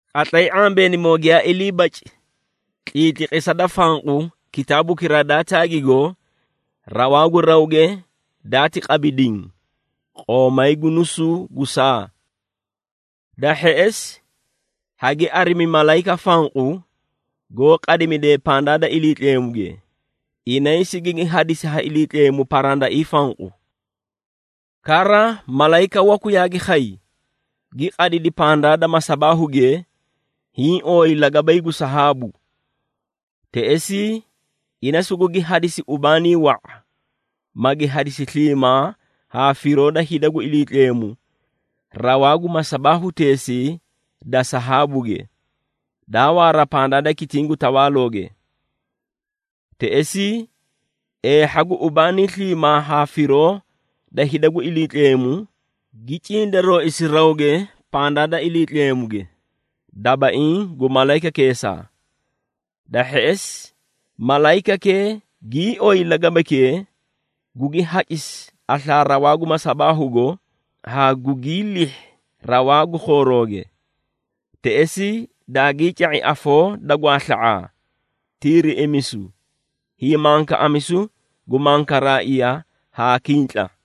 Qatlay ⁄ambeenimoo giyaa ilii baci tliitliqisa da fanqu kitaabukiraa daa taagigo, rawaa gu rawge daati qabi diĩ, qoomay gu nusuu gu saa. Da hheꞌesi, hagi arimi malayika fanqu, goó qadimidee pandaa da Iliitleemuge, inay sigigi hadisi ha Iliitleemu parandaiĩ fanqu. Kara malayika waku yaagi khay, gi qadidi pandaa da masabaahuge hiĩ ooyi lagabay gu sahaabu. Teꞌesii, ina sugugi hadisi ubaanii wa⁄a, magi hadisi sliimaa haa firoo da hida gu Iliitleemu, rawaa gu masabaahuteesii da sahaabuge, daa waara pandaa da kitiĩ gu tawaalooge. Teꞌesii, eehha gu ubaanii sliimaa haa firoo da hida gu Iliitleemu, gi cindarooisi rawge pandaa da Iliitleemuge, dabaiĩ gu malayikakeesaa. Da hheꞌesi, malayikakee gii oyi lagabaykee, gugi hacisi aslaa rawaa gu masabaahugo haa gugii lihhi rawaa gu khoorooge. Teꞌesii, daagii ca⁄i afoo da gwaasla⁄aa, tiiriꞌimisu, hiimankaꞌamisu gu mankaraaiya haa kintla.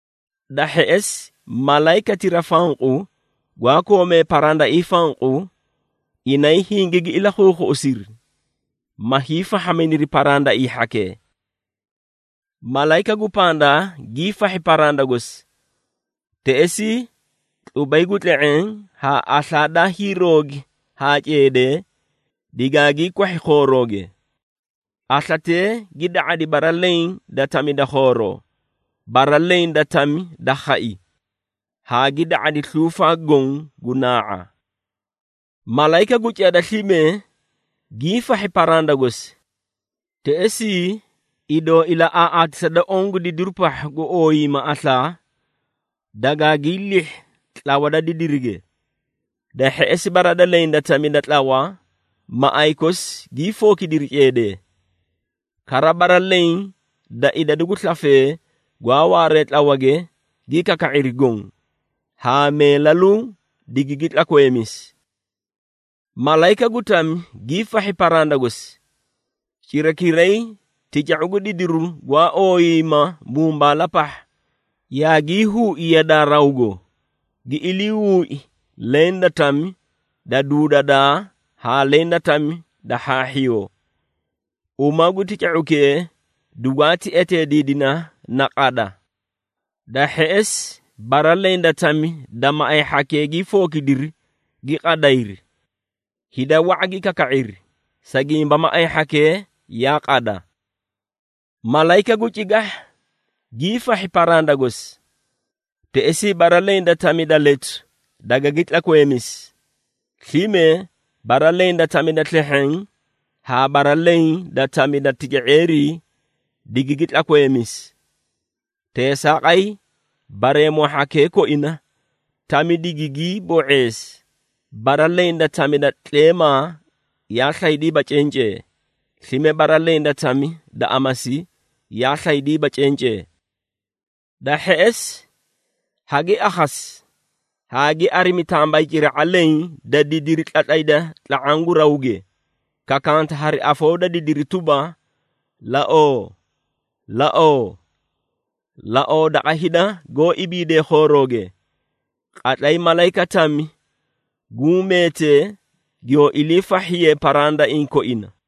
Da hheꞌesi, malayikatira fanqu gwaa koomee parandaiĩ fanqu, inay hingigi ilakhuukhuꞌusiri, ma hiifahhaminiri parandaiĩ hhakee. Malayika gu pandaa giifahhi paranda gosi. Teꞌesii tlubay gu tle⁄eẽ haa aslaa daa hiiroogi haa ceedee, digaagii kwahhi khoorooge. Aslatee gi da⁄adi bara leẽ da tami da khooroo, bara leẽ da tami da khai haa gi da⁄adi sluufaa goõ gu naa⁄a. Malayika gu cada slime giifahhi paranda gosi. Teꞌesii, idoo ilaꞌaaꞌaatisa da oõ gu didiru pahha gu ooyiiyima aslaa, dagaagii lihhi tlawa da didirige. Da hheꞌesi bara leẽ da tami da tlawa, maꞌay kosi gii fookidiri ceedee. Kara bara leẽ da idadu gu slafee gwaa waaree tlawage gi kaka⁄iri goõ, haa meelaluu digigi tlakweemisi. Malayika gu tami giifahhi paranda gosi. Cirakiray tica⁄u gu didiru gwaa ooyiiyima mumbaala pahha, yaagii huui yadaa rawgo, gi ilii huui leẽ da tami da duudadaa haa leẽ da tami da hhaahhiyoo. Uma gu tica⁄ukee dugwaati eteediidina na “Qada.” Da hheꞌesi bara leẽ da tami da maꞌay hhakee gii fookidiri gi qadayri. Hida wa⁄a gi kaka⁄iri, sa gimba maꞌay hhakee yaa qada. Malayika gu cigahha giifahhi paranda gosi. Teꞌesii, bara leẽ da tami da letu dagagi tlakweemisi, slime bara leẽ da tami da slehheẽ haa bara leẽ da tami da tica⁄eerii digigi tlakweemisi. Teesaaqay, bareemoo hhakee koina tami digigii bo⁄eesi, bara leẽ da tami da tleemaa yaa slaydiiba cencee, slime bara leẽ da tami da amasi yaa slaydiiba cencee. Da hheꞌesi, hagi akhasi haa gi arimi tambayciraꞌa leẽ da didiri tlatlayda tla⁄aã gu rawge, kakanta hari afoo da didiri tuba, “Laoo! Laoo! Laoo daqa hida goó ibiidee khooroge, qatlay malayika tami guũ meetee giyoo iliifahhiyee parandaiĩ koina!”